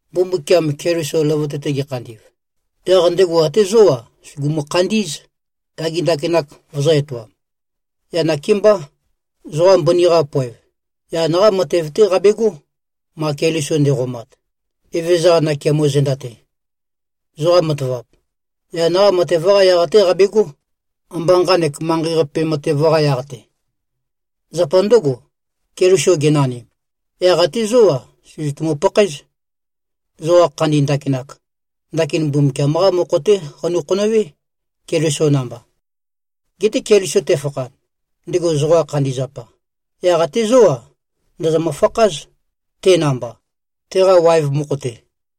Mbumbukiam Keliso løvøte-te gekhandi꞉v, yaq ndego até zó-a, sùgumu-khandí꞉z, yage ndakinak vøzø̄-etoam. Yaq nakémbá, zoqa mbøni-qa poev, yan-qá matev-té qabegó, ma Keliso nde꞉qomat, Eve-qa nakeamo zenda-te. Zoqa matavap, yan-qá matev-qa yaq-té qabegó, ambá nqanek manqei-qape matev-qa yaq-te. Zapa ndǿgo, Keliso genanim, yaq até zó-a, sø̀zøtumu-pakhaéz. Zoqa khandi ndakinak, ndakin Mbumbukiam-qá mokho-té qanu-khonøwé, Keliso namba. Geté Keliso tefakhan, ndego zoqa khandi zapa, yaq até zó-a, ndòzomø-fakház, te namba, teqa waev mokho-te.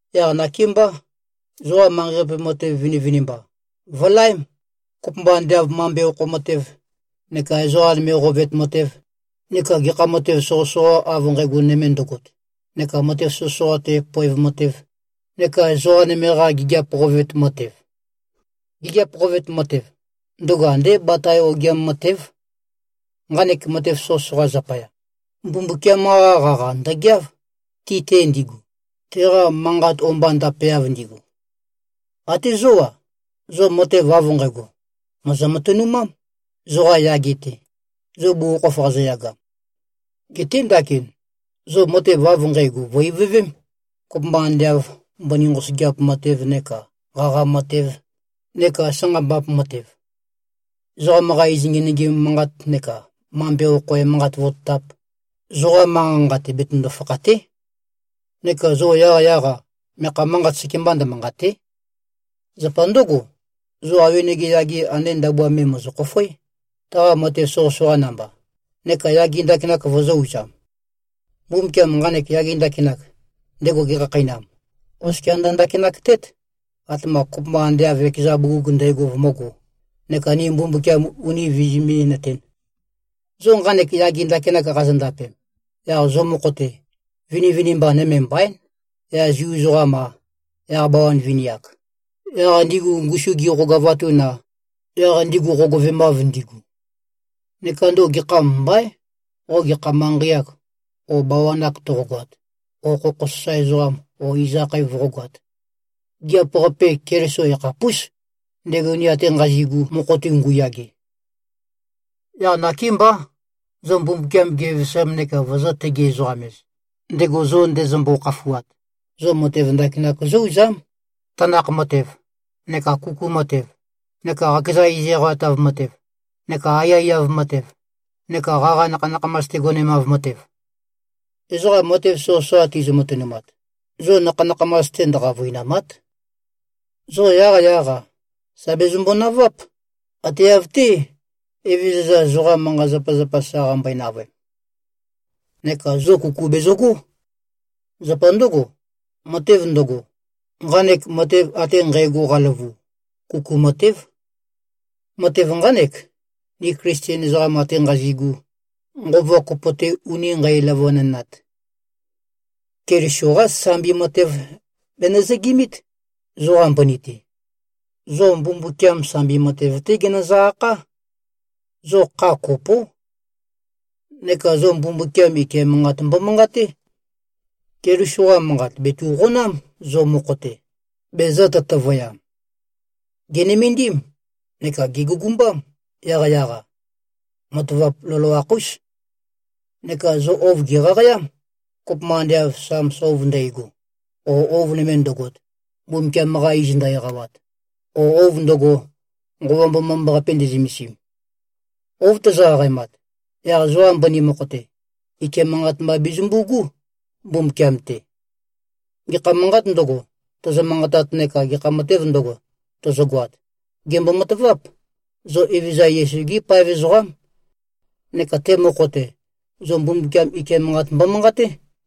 Yaq nakémbá, zoqa manqei-qape matev vinivinimba, vø̀laém, kopømba ande av mambe okho matev, neka ezoqa nøme qovet matev, neka gekha matev soqøsoqa av nqægo nøme ndøgot, neka matev soqøsoqa-te poev matev, neka ezoqa nøme-qa gigiap qovet matev. Gigiap qovet matev, ndøgo andé batae-te ogiam matév. Nqanek matev soqøsoqa zapaya, Mbumbukiam-qa qaqa ndø̀geáv, ti-te ndigu, teqa manqat o-mba ndapeav ndigu. Até zó-a, zo matev av nqægo mòzo-matønumám, zoqa yage-te, zo bugukhokhof qazoyagam. Geté ndakin, zo matev av nqægo vø̀-ivøvém, kopømba ande av mbøni nqosøgeap matev, neka qaqa matev neka sanqambap matev. Ezoqam-qa iz ngenøgim manqat, neka mambe okho emanqat vototap, zoqa manqa-nqa-te betøndo-fakhàte᷄. Neka zo yaqyaq-a, meakha manqat sekemba ndømanqàte᷄. Zapa ndǿgo, zo awenege yage ande ndabua me, mòzo-khofoé, taqa matev soqøsoqa namba, neka yage ndakinak vozō-uzam. Mbumbukiam nqanek yage ndakinak, ndego gekhakheinam, oskia ndø-ndakinak-tét, atema kopømba ande av ekeza bugug ndægo vømǿgō, neka ni Mbumbukiam uni vizimí-nøtēn. Zo nqanek yage ndakinak qazondapem, yaq zo mokho-te, vinivinimba nøme mbaín, yaq Zu ezoqam-a, yaq bawan vini-ak; yaq ndigu ngusu gizø-qogavatun-a, yaq ndigu qogøvemav ndigu. Neka ndøgo gekham mbaín, qo gekha manqei-ak o bawan-ak toqogoat, o khokho sasae ezoqam o iz akhae voqógoāt. Gigiap-qape Keliso yakhapús, ndego ni ate nqazi꞉gu mokho-te ngu꞉yage. Yaq nakémbá, zo Mbumbukiam gevevesam neka vozō-tegi-ezoqam-ez, ndego zo ndezømbo-khafuat, zo matev ndakinak zó-uzám, tanakh matev, neka kuku matev, neka qakeza iz eqawatav matev, neka aiyaiyav matev, neka qaqa nakha-nakhamas-te gonemav matev. Ezoqa matev soqøsoqa tizø-matønumat, zo nakha-nakhamas-te ndø-qavøinàma᷄t. Zo yaqyaq-a, sà bezømbo-naváp, ate av-té, Evezøza zoqa manqa-zapazapa sa qambøe-navøem. Neka zo kuku bezøgó. Zapa ndǿgo, matev ndøgo, nqanek matev ate nqægo qaløvu, kuku matév. Matev nqánek, ni Klisten ezoqam ate nqazi꞉gu, nqova kopo-te uni nqæløvønønat. Keliso-qá sambi matev bezø-nøzøgimít, zoqa mbøni-te. Zo Mbumbukiam sambi matev-té genøzø-akhá. Zo kha kopó. Neka zo Mbumbukiam ike manqat mbomanqaté. Keliso-qa Manqat bètu꞉qonám, zo mokho-te, bezø̄-tøtøvøyam. Gè꞉nømendím neka gègugumbám, yaqyaq-a. Matavap loloakh-ús. Neka zo ouv gèqaqayám, kopømba ande av Sams ouv ndægo, o ouv nøme ndøgot, Mbumbukiam-qa iz ndø-eqawat, o ouv ndøgo, Nqova Mbomambaqape nde꞉zømesim. Ouv tozo-qaqaemat, yaq zoqa mbøni mokho-te, ike manqat mba bezømbu꞉gú, Mbumbukiam-te. Gekha manqāt ndøgo, tozo-manqatat neka gekha matēv ndøgo, tozogoat, gèmbo-mataváp, zo Evezøza Yesu-gí paev ezoqám. Neka te mokho-te, zo Mbumbukiam ike manqat mbomanqaté.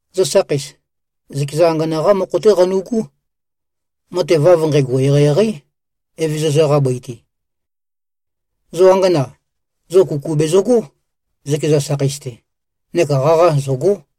Zo sakheis, zøkeza angana-qá mokho-té qanu꞉gú. Matev av nqægo eqeieqeí, Evezøza-qa bøi-te. Zo angana, zo kuku bezøgó, zøkeza sakheis-te, neka qaqa zø̀go᷄.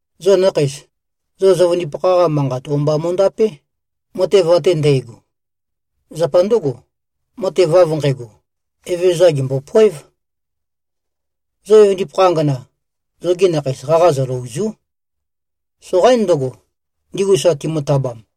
Zo nakheis, zo zøvøndipakha-qa manqat o-mba mo꞉ndapé, matev ate ndægo. Zapa ndǿgo, matev av nqægo, Evezøza gèmbopoév. Zo evøndipakha angana, zogi nakheis qaqa zølø̀ozu᷄. Soqaín ndøgo, ndigu sa timø-tabam.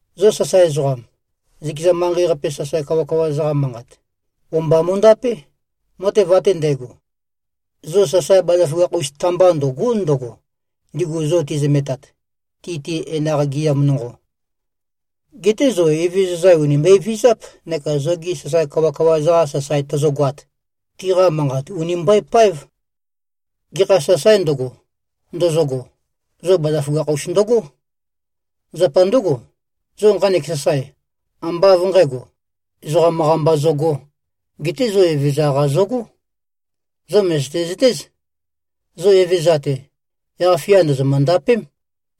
Zo sasae ezoqam, zøkeza manqei-qape sasae kawakawa-za-qa manqat, o-mba mo꞉ndapé, matev ate ndægo. Zo sasae bazaføgakh-us ta-mbá ndø̀go᷄ ndøgo, ndigu zo tizømetat, ti-te enaq gɨam nonqo. Geté zo Evezøza ùni mbøevizáp neka zogi sasae kawakawa-za-qa sasae tozogoat, tiqa manqat ùni mbøepáev. Gekha sasaē ndøgo, ndozogo, zo bazaføgakh-us ndøgó. Zapa ndǿgo, zo nqanek sasae, ambá av nqǣgo, ezoqam-qa mba zogō, geté zo Evezøza-qa zogó. Zo mø̀zøte-zøtéz, zo Evezøza-te, yaq-fia ndòzomø-ndapém,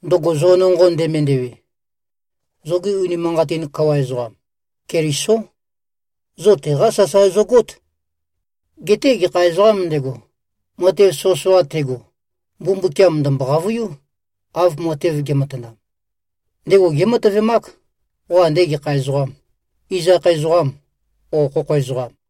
ndøgo zo nonqo ndemendewe. Zoge unimanqatin kawa ezoqam, Kelisó. Zo teqá sasae zogót. Geté gekha ezoqām ndego, matev soqøsoqa tego, Mbumbukiam ndø̀mbo-qavøiú, av matev ge꞉matanam. Ndego gématøvemák, qo ande gekha ezoqam, iz akhae ezoqām, ō, khokho ezoqam.